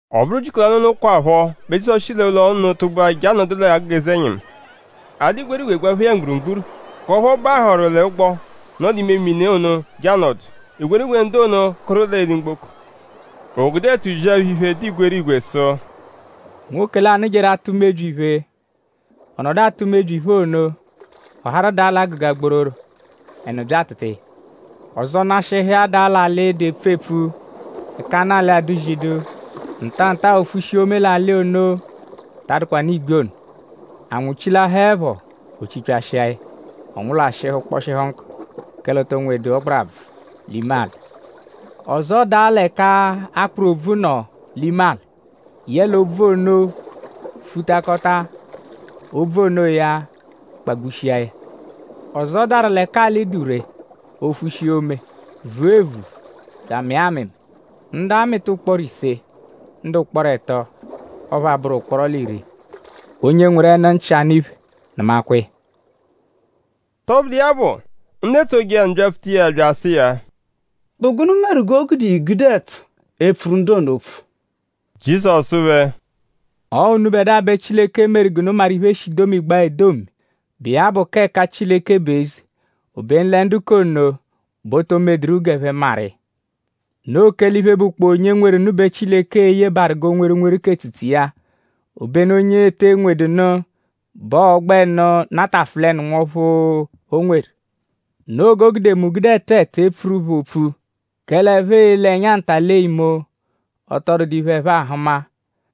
Ọ bụru ujiku lanụ onokwaphọ bẹ Jizọsu shi l'ụlo ono tụgbua je anọdu l'agụga eze-ẹnyimu. A dụ igwerigwe gbaphee ya mgburugburu; k'ọphu ọ bahụru l'ụgbo, nọ l'ime mini ono je anọdu. Igwerigwe ndu ono kụru l'eli-mgboko. O gude ẹtu zia phẹ iphe, dụ igwerigwe sụ: “Nwoke lanụ jeru atụ mebyi iphe. Ọ nọdu atụ mebyi iphe ono; ọ harụ daa l'agụga gbororo; ẹnu bya atụtua ya. Ọzo nashịhu iya daa l'alị, dụ epfu-epfu; ẹka anụ alị adụ-zidu. Ntanta-a o fushia ome l'anụ alị ono, ta adụkwanu igbi ono. Anwụ chilahaẹpho; o chipyashia ya. Ọ nwụlwashihu kpọshihu nkụ; kẹle o to nwedu ọgbarabvu l'ime alị. Ọzo daa l'ẹka akpụru obvu nọ l'ime alị. Yẹle obvu ono futakọta. Obvu onoya kpagbushia ya. Ọzo daru l'ẹka alị dụ ree. O fushia ome; vua evuvu; bya amịa amịmi. Ndu amịta ụkporo ise; ndu ụkporo ẹto; ọphu abụru ụkporo l'iri. “Onye nweru ẹnu-nchị, anụ iphe nụmakwa iya!” Tọbudu iya bụ; ndu etsoje iya nụ byapfuta iya bya asụ iya: “?Bụ gụnu meru g'o gude i gude ẹtu epfuru ndu ono opfu?” Jizọsu sụ phẹ: “Ọo unubẹdua bẹ Chileke meru g'unu maru iphe, e shi domigbaa edomi, bụ iya bụ k'ẹka Chileke bụ eze; obenu lẹ ndu k'ono bẹ o to medụru g'ẹphe maru iya. Noo kẹle iphe, bụkpoo onye nweru nụ bẹ Chileke e-yebaaru g'o nweru nweru k'etsutsu iya. Obenu onye ete nwedu nụ bẹ ọo-gbẹnu natafụlenu nwọphu, o nweru. Noo g'o gude mu gude ẹtu ẹtu epfuru phẹ opfu. Kẹle ẹphe e-le ẹnya nta lee imo; ọ tọ dụdu iphe, ẹphe ahụma.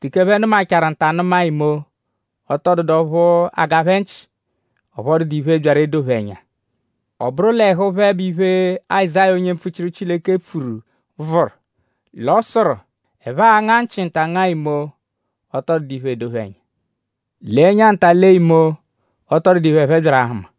Teke ẹphe nụmachaaru nta nụma imo; ọ tọ dụdu ọphu aga phẹ nchị. Ọphu ọ dụdu iphe, byaru l'edo phẹ ẹnya. Ọ bụru l'ẹhu phẹ bẹ iphe, Azáya onye mpfuchiru Chileke pfuru vụru; l'ọ sụru: “ ‘Ẹphe a-nga nchị nta ngaa imo; ọ tọ dụdu iphe, edo phẹ ẹnya. Lee ẹnya nta lee imo; ọ tọ dụdu iphe, ẹphe byaru ahụma.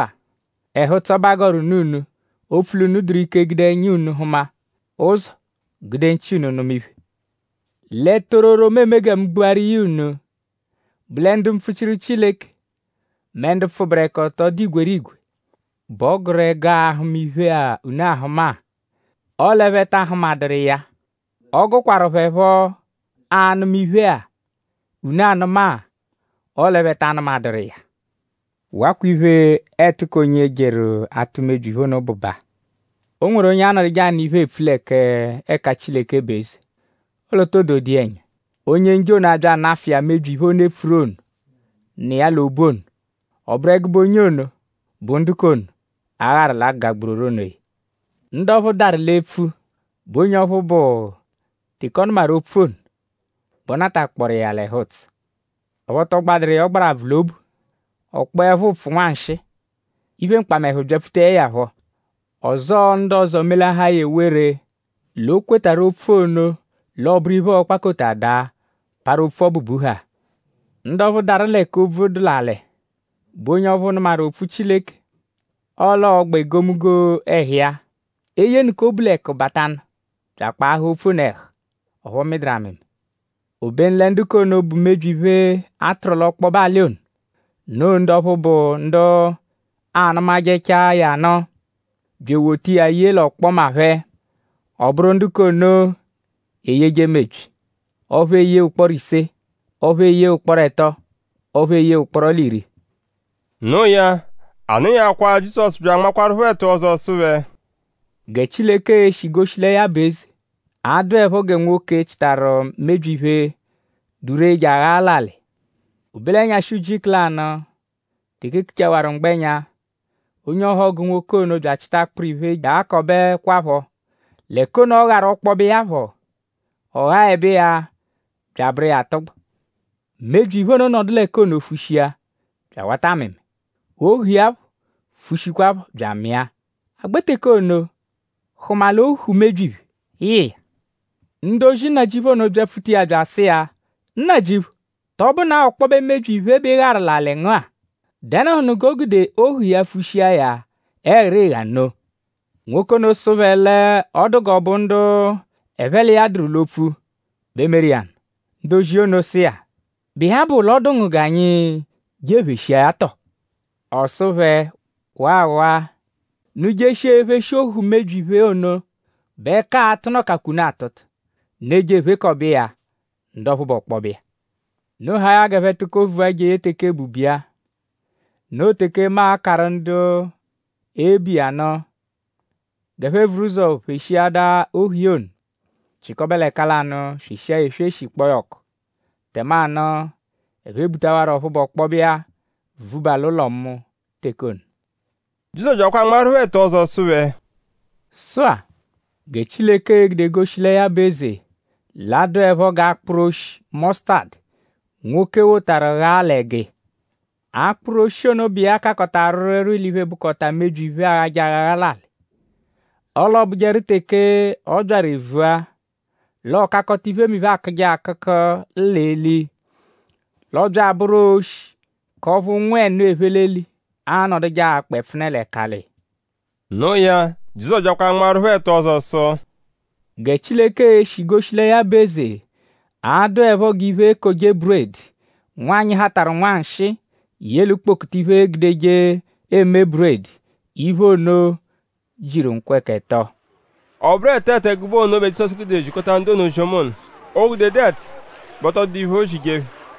“Sụ-a; ẹhu-ụtso bẹ a gọru nụ unu; opfu l'unu dụru ike gude ẹnya unu hụma ụzo; gude nchị unu nụma iphe. Lẹ tororo, mu eme gẹ mu gbuaru iya unu bụ lẹ ndu mpfuchiru Chileke; mẹ ndu pfụberekoto, dụ igwerigwe bẹ ọ gụru ẹgu ahụma iphe-a, unu ahụma-a; ọle ẹphe ta ahụmaduru iya. Ọ gụkwaru phẹ phọ anụma iphe-a, unu anụ-a; ọle ẹphe ta anụmaduru iya.” “Wakwa iphe, ẹtu k'onye jeru atụ mebyi iphe ono bụ baa: O nweru onye anọduje anụ iphe, eepfu lẹ k'ẹka Chileke bụ eze; ọle o too dodu iya ẹnya. Onye-Njọ ono abya anafụ iya mebyi iphe ono, e pfuru, nọ iya l'ime obu ono. Ọ bụru ẹgube onye ono bụ ndu k'ono, a gharu l'agụga gbororo onoya. Ndu ọphu daru l'epfu bụ onye ọphu bụ: teke ọ nụmaru opfu ono bẹ ọ natakpọoru iya l'ẹhu-ụtso. Ọphu ọ tọ gbadụru iya ọgbarabvu l'obu. Ọ kpọepho ụpfu nwanshịi; iphe mkpamẹhu byapfutaẹ ya phọ; ọzoo ndu ọzo melahaa ya ewere l'o kwetarụ opfu ono; l'ọ bụru iphe, ọo-kpakota daa; parụ opfu ọbu buhaa. Ndu ọphu daru l'ẹka obvu dụ l'alị; bụ onye ọphu nụmaru opfu Chileke; ọle ọogba egomunggo ẹhu iya. Eyenụka obu l'ẹku batanụ bya akpaahaa opfu ono ẹhu. Ọphu ọ mịduru amịmi. Obenu lẹ ndu k'ono, bụ mebyi iphe, a tụru l'ọkpobe alị ono; noo ndu ọphu bụ ndu anụmajechaa ya nụ; bya ewota iya ye l'ọkpoma phẹ. Ọ bụru ndu k'ono eyeje mebyi. Ọphu eyee ụkporo ise; ọphu eyee ụkporo ẹto; ọphu eyee ụkporo l'iri.” Noo ya; a nọnyakwaa Jizọsu byakwa anmaaru phẹ ẹtu ọzo sụ phẹ: “Gẹ Chileke e-shi goshi lẹ ya bụ eze a-dụepho gẹ nwoke, chịtaru mebyi iphe, dụ ree je aghaa l'alị. O be l'ẹnyashi ujiku lanụ; teke e kuchawaru mgbẹnya; onye ọhogu nwoke ono bya achịta akpụru iphe je aghakwaaphọ l'ẹka ono, ọ gharu ọkpobe iya phọ. Ọ ghaẹbe iya bya abụru iya atụgbu. Mebyi iphe ono nọdu l'ẹka ono fushia bya awata amịmi. Ohu iya phọ fushikwaaphọ bya amịa. A gbẹ teke ono hụma l'ohu mebyi iphe yị iya. Ndu ozi nnajịuphu ono byapfuta iya bya asụ iya: ‘Nnajịuphu;?tọ bụnaa ọkpobe mebyi iphe bẹ ị gharu l'alị ngu-a??Dẹnuhunu g'o gude ohu iya fushia ya ẹghirigha nno?’ Nwoke ono sụ phẹ l'ọ dụ g'ọ bụ ndu ẹphe l'iya dụru l'opfu bẹ meru iya nụ. Ndu ozi ono sụ iya: ‘?Bụ iya bụ l'ọ dụ ngu g'anyi je epheshia ya tọo?’ Ọ sụ phẹ: ‘Waawaa! Unu -jeshia epheshi ohu mebyi iphe ono bẹ ẹka a-tụnukakwa unu atụtu; unu eje ephekọbe iya ndu ọphu bụ ọkpobe iya. Unu haa ya g'ẹphe tụko vua jeye teke ebubu iya. Noo teke mu a-karụ ndu ebu iya nụ g'ẹphe vuru ụzo pheshiada ohu iya ono; chịkobe l'ẹka lanụ; sweshia ya esweshi kpọo ya ọku. Tẹmanu ẹphe ebutawarọ ọphu bụ ọkpobe iya vuba l'ụlo mu teke ono.’” Jizọsu byakwa anmaaru phẹ ẹtu ọzo sụ phẹ: “Sụ-a; gẹ Chileke e-gude goshi lẹ ya bụ eze l'a-dụepho g'akpụru oshi mọsutadu, nwoke wotaru ghaa l'ẹgu iya. Akpụru oshi ono bụ iya kakọta rwịirwiirwii l'iphe, bụkota mebyi iphe, aaghajẹ aghagha l'alị. Ọle ọ bụjeru teke ọ byaru evua; l'ọ kakọta iphemiphe, aakụje akụku l'eli. L'ọ bya abụru oshi k'ọphu ụnwu ẹnu, ephe l'eli anọduje akpa ẹpfune l'ẹkali iya.” No iya; Jizọsu byakwa anmaaru phẹ ẹtu ọzo sụ: “Gẹ Chileke e-shi goshi lẹ ya bụ eze; a-dụepho g'iphe-ekoje-buredi, nwanyị hatarụ nwanshịi ye l'ukpokutu iphe, eegudeje eme buredi. Iphe ono jiru nkwẹka ẹto. “Ọ bụru ẹtu ẹtu ẹgube ono bẹ Jizọsu gude zikọta ndu ono ozi-ọma ono. O -gudedu ẹtu bẹ ọ tọ dụdu iphe, oozije phẹ.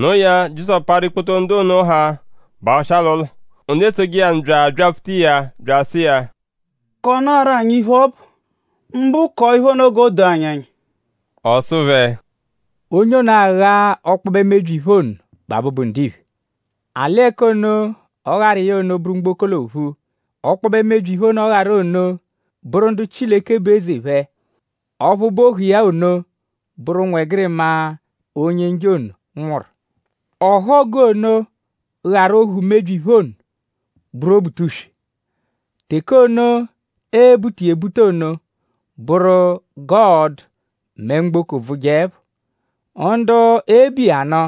Noo ya; Jizọsu parụ ikpoto ndu ono haa; bahụshia l'ụlo. Ndu etsoje iya nụ bya abyapfuta iya; bya asụ iya: “Kọnaaru anyi iphe, ọ bụ; mbụ k'ohu iphe ono g'o doo anyi ẹnya.” Ọ sụ phẹ: “Onye ono, agha ọkpobe mebyi iphe ono bụ Abụbu-Ndiphe. Alị ẹka ono, ọ gharu iya ono bụru mgboko l'ophu. Ọkpobe mebyi iphe ono, ọ gharu ono bụru ndu Chileke bụ eze phẹ. Ọphu bụ ohu iya ono bụru ụnwegirima Onye-Njọ ono nwụru. Ọhogu ono, gharu ohu mebyi-iphe ono bụru Obutuswe. Teke ono, ee-buta iya ebuta ono bụru g'ọo-dụ mẹ mgboko bvụjeepho. Ndu e-bu iya nụ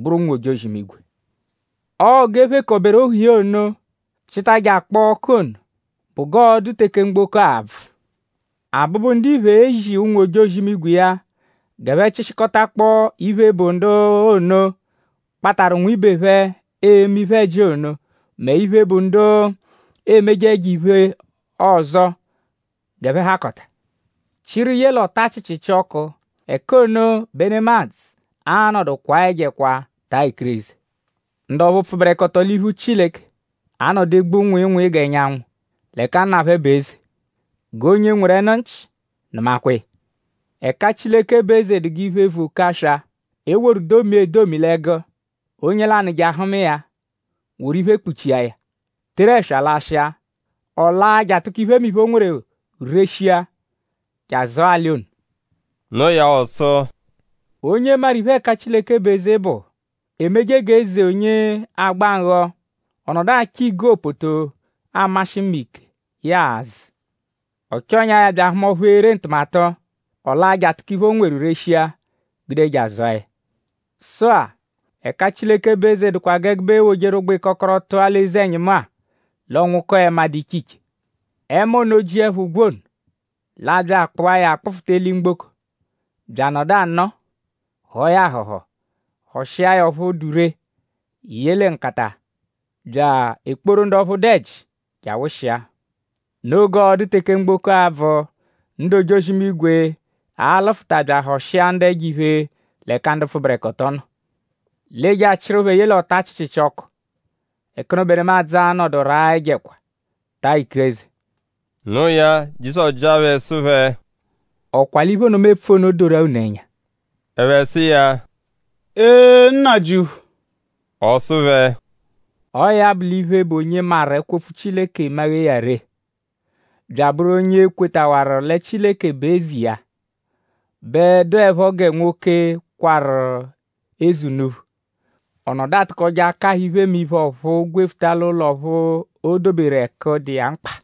bụru ụnwu-ojozi-imigwe. Ọo g'e phekọberu ohu iya ono chịta je akpọo ọku ono bụ g'ọo-dụ teke mgboko a-bvụ. Abụbu-Ndiphe e-zi ụnwu-ojozi-imigwe iya g'ẹphe chịshikotakpo iphe, bụ ndu ono, kpatarụ nwibe phẹ eme iphe-ẹji ono mẹ iphe, bụ ndu emeje ẹjo-iphe ọzo g'ẹphe hakọta; chịru ye l'ọta chịchichi ọku. Ẹka ono bẹ nemadzụ a-nọdu kwaa ẹjo ẹkwa; taa ikireze. Ndu ọphu pfụberekoto l'iphu Chileke a-nọdu egbu nwịinwii g'ẹnyanwu l'ẹka Nna phẹ bụ eze. G'onye nweru ẹnu-nchị nụmakwa iya!” “Ẹka Chileke bụ eze dụ g'iphe, vu oke aswa, e woru domia edomi l'ẹgu. Onye lanụ je ahụma iya woru iphe kpuchia ya; teru ẹswa lashịa. Ọ laa je atụko iphemiphe, o nweru reshia je azụa alị ono.” Noo ya; ọ sụ: “Onye maru iphe, ẹka Chileke bụ eze bụ; emeje g'eze onye agba nghọ; ọ nọdu achọ igopoto, amashị mma ike, ya a-zụ. Ọ chọnyaa ya; bya ahụma ọphu ere ntụmatu. Ọ laa je atụko iphe, o nweru reshia gude je azụa ya. “Sụ-a; Ẹka Chileke bụ eze dụkwa g'ẹgube eewojeru ụgbu-ịkokoro tụa l'eze-ẹnyimu-a; l'ọ nwụkoo ẹma, dụ iche iche. Ẹma ono -jiẹpho ụgbu ono; l'a bya akpụa ya kpụfuta eli-mgboko; bya anọdu anọo; họo ya ahọho; họshia ya ọphu dụ ree ye lẹ nkata bya ekporu ndu ọphu dụ ẹji je awụshia. Noo g'ọo-dụ teke mgboko a-bvụ. Ndu ojozi-imigwe a-lụfuta bya ahọshia ndu ẹjo-iphe l'ẹka ndu pfụberekoto nọ. L'ee-je achịru phẹ ye l'ọta chịchichi ọku. Ẹka ono bẹ nemadzụ a-nọdu raa ẹjo ẹkwa; taa ikireze.” Noo ya; Jizọsu jịa phẹ sụ phẹ: “?Ọ kwa l'iphe ono, mu epfu ono doru-a unu ẹnya?” Ẹphe sụ iya: “Ee Nnajịuphu!” Ọ sụ phẹ: “Ọo ya bụ l'iphe, bụ onye maru ẹkwo-opfu Chileke maghee ya ree; bya abụru onye kwetawaru lẹ Chileke bụ eze iya bẹ dụepho gẹ nwoke, kwarụ eze unuphu. Ọ nọdu atụkoje akahụ iphe mẹ iphe ọ̀phúú gwefuta l'ụlo ọphu o doberu ẹku, dụ iya mkpa.”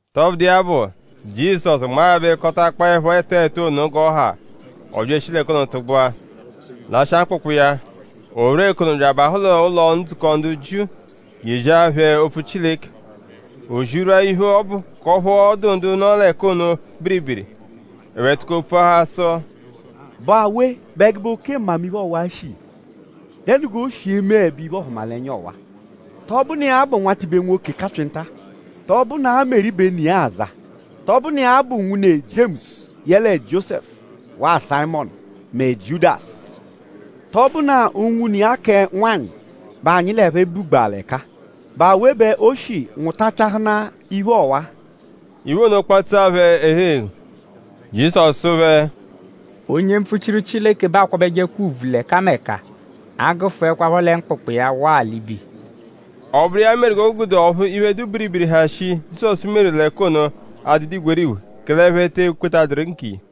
Tọbudu iya bụ; Jizọsu nmaẹbekotakpoepho ẹtu ẹtu ono g'ọ ha; ọ bya eshi l'ẹka ono tụgbua; lashịa mkpụkpu iya. O rwua ẹka ono bya abahụ l'ụlo-ndzukọ ndu Jiu je eziahaa phẹ opfu Chileke. O zirwua iphe ọbu k'ọphu ọ dụ ndu nọ l'ẹka ono biribiri. Ẹphe tụko pfuahaa sụ: “?Bụ awe bẹ ẹgube oke mmamiphe ọwa-a shi iya??Dẹnu g'o shi emeẹbe iphe-ọhumalenya ọwa-a? ?Tọ bụnu iya-a bụ nwatibe nwoke kapyịnta-a??Tọ bụnua Meri bẹ ne iya aza??Tọ bụnu iya bụ nwune Jiemusu yẹle Jiósẹfu; waa Sayịmonu; mẹ Jiudasu? ?Tọ bụnaa unwune iya kẹ nwanyị bẹ anyi l'ẹphe bugbaa l'ẹka-a??Bụ awe bẹ o shi nwụtachahunaa iphe ọwa-a?” Iphe ono kpatsu phẹ ẹhu-eghu. Jizọsu sụ phẹ: “Onye mpfuchiru Chileke bẹ aakwabẹjekwa ùbvù l'ẹkameka; agụfuekwapho lẹ mkpụkpu iya waa l'ibe iya.” Ọ bụru iya meru g'o gude ọphu iphe, dụ biribiri, ha shii, Jizọsu meru l'ẹka ono adụdu igwerigwe kẹle ẹphe te ekwetaduru nkiya.